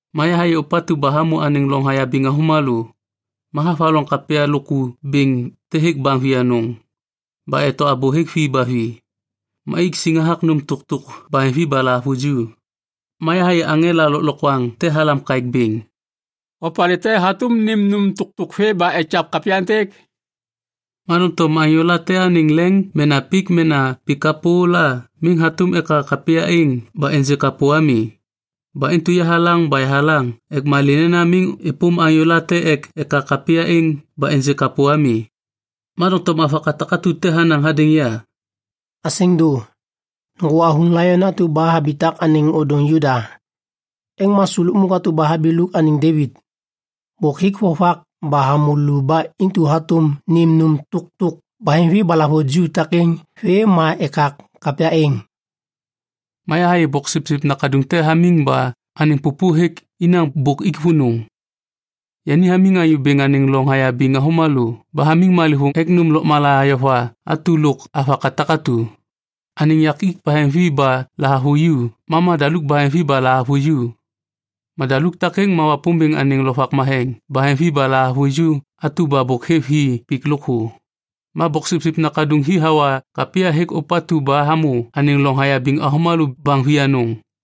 Ma yahayê ôpatu ba hamô anêŋ loŋ hayabiŋ avômalô. Ma havaloŋ kapya lôku bêŋ te hêk baŋ vianôŋ. Ba eto abô hêk vi ba vi. Ma ik siŋ hathak nôm tôktôk baheŋvi ba lahavuju. Ma yahayê aŋela lôklokwaŋ te halam kaêk bêŋ, “Opalê te hatôm nêm nôm tôktôk vê ba ekak kapya êntêk?” Ma doŋtom anyôla te anêŋ leŋ mena pik mena pik kapô la miŋ hatôm ekak kapya êŋ ba ênjê kapô ami. Ba intu yahalaŋ ba yahalaŋ ek malê nena miŋ êpôm anyô late ek ekak kapya êŋ ba ênjê kapô ami. Ma doŋtom avaka takatu te hanaŋ hadêŋ ya, “Asêŋ dô. Nôŋgô avuŋ laion atu ba habitak anêŋ ôdôŋ Juda. Êŋ ma su lukmuk atu ba habiluk anêŋ Devit. Bôk hik vovak ba hamô lu ba intu hatôm nêm nôm tôktôk baheŋvi ba lahavuju takêŋ vê ma ekak kapya êŋ.” Ma yahayê Boksipsip Nakaduŋ te hamiŋ ba anêŋ pôpô hêk inaŋ bôk ik vônô. Yani hamiŋ Anyô Bêŋ anêŋ loŋ hayabiŋ avômalô ba hamiŋ malêvôŋ ek nôm lôkmala ayova atu lôk avaka takatu. Anêŋ yakik baheŋvi ba lahavuju ma madaluk baheŋvi ba lahavuju. Madaluk takêŋ ma Wapômbêŋ anêŋ lovak matheŋ baheŋvi ba lahavuju atu ba bôk hêv hi pik lôkthô. Ma Boksipsip Nakaduŋ hi hawa kapya hêk ôpatu ba hamô anêŋ loŋ hayabiŋ avômalô baŋ vianôŋ.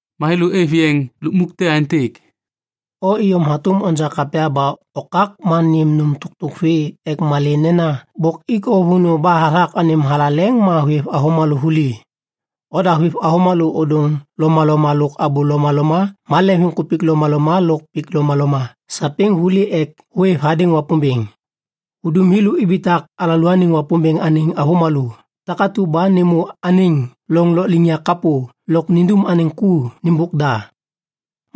Ma thêlô êv yeŋ lukmuk te aêntêk, “O iyom hatôm onja kapya ba okak ma nêm nôm tôktôk vê ek malê nena bôk ik o vônô ba hathak anêm thalaleŋ ma hôêv avômalô vuli. Oda hôêv avômalô ôdôŋ lomaloma lôk abô lomaloma ma leŋviŋkupik lomaloma lôk pik lomaloma sapêŋ vuli ek hôêv hadêŋ Wapômbêŋ. Hudum thêlô ibitak alalôaniŋ Wapômbêŋ anêŋ avômalô takatu ba nêmô anêŋ loŋ lôkliŋyak kapô lôk nindum anêŋ ku nêmbôk da.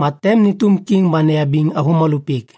Ma tem nêtôm kiŋ ba neyabiŋ avômalô pik.”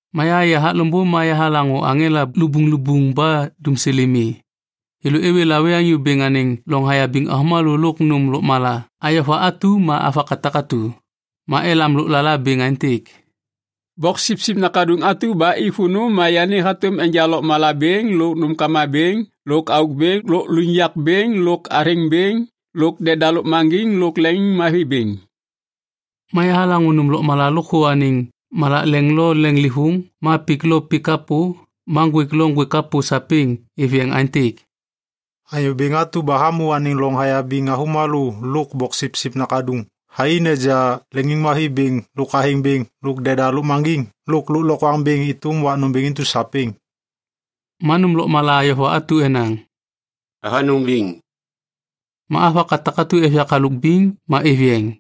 Ma yahayê hathak loŋbô ma yahalaŋô aŋela lubuŋlubuŋ ba dumsêlê mi. Thêlô êwê lawê Anyô Bêŋ anêŋ loŋ hayabiŋ avômalô lôk nôm lôkmala ayova atu ma avaka takatu. Ma elam lôklala bêŋ aêntêk, “Boksipsip Nakaduŋ atu ba ik vônô ma yani hatôm enja lôklokwaŋ bêŋ lôk nômkama bêŋ lôk auk bêŋ lôk lôkliŋyak bêŋ lôk athêŋ bêŋ lôk deda lôkmaŋgiŋ lôk leŋiŋmavi bêŋ.” Ma yahalaŋô nôm lôkmala lôkthô anêŋ malak leŋ lo leŋlêvôŋ ma pik lo pik kapô ma ŋgwêk lo ŋgwêk kapô sapêŋ êv yeŋ aêntêk, “Anyô Bêŋ atu ba hamô anêŋ loŋ hayabiŋ avômalô lôk Boksipsip Nakaduŋ thai neja leŋiŋmavi bêŋ lôk athêŋ bêŋ lôk deda lôkmaŋgiŋ lôk lôklokwaŋ bêŋ êtôm wak nômbêŋ intu sapêŋ.” Ma nôm lôkmala ayova atu enaŋ, “Avanôŋ biŋ”. Ma avaka takatu êv yak halôk biŋ ma êv yeŋ.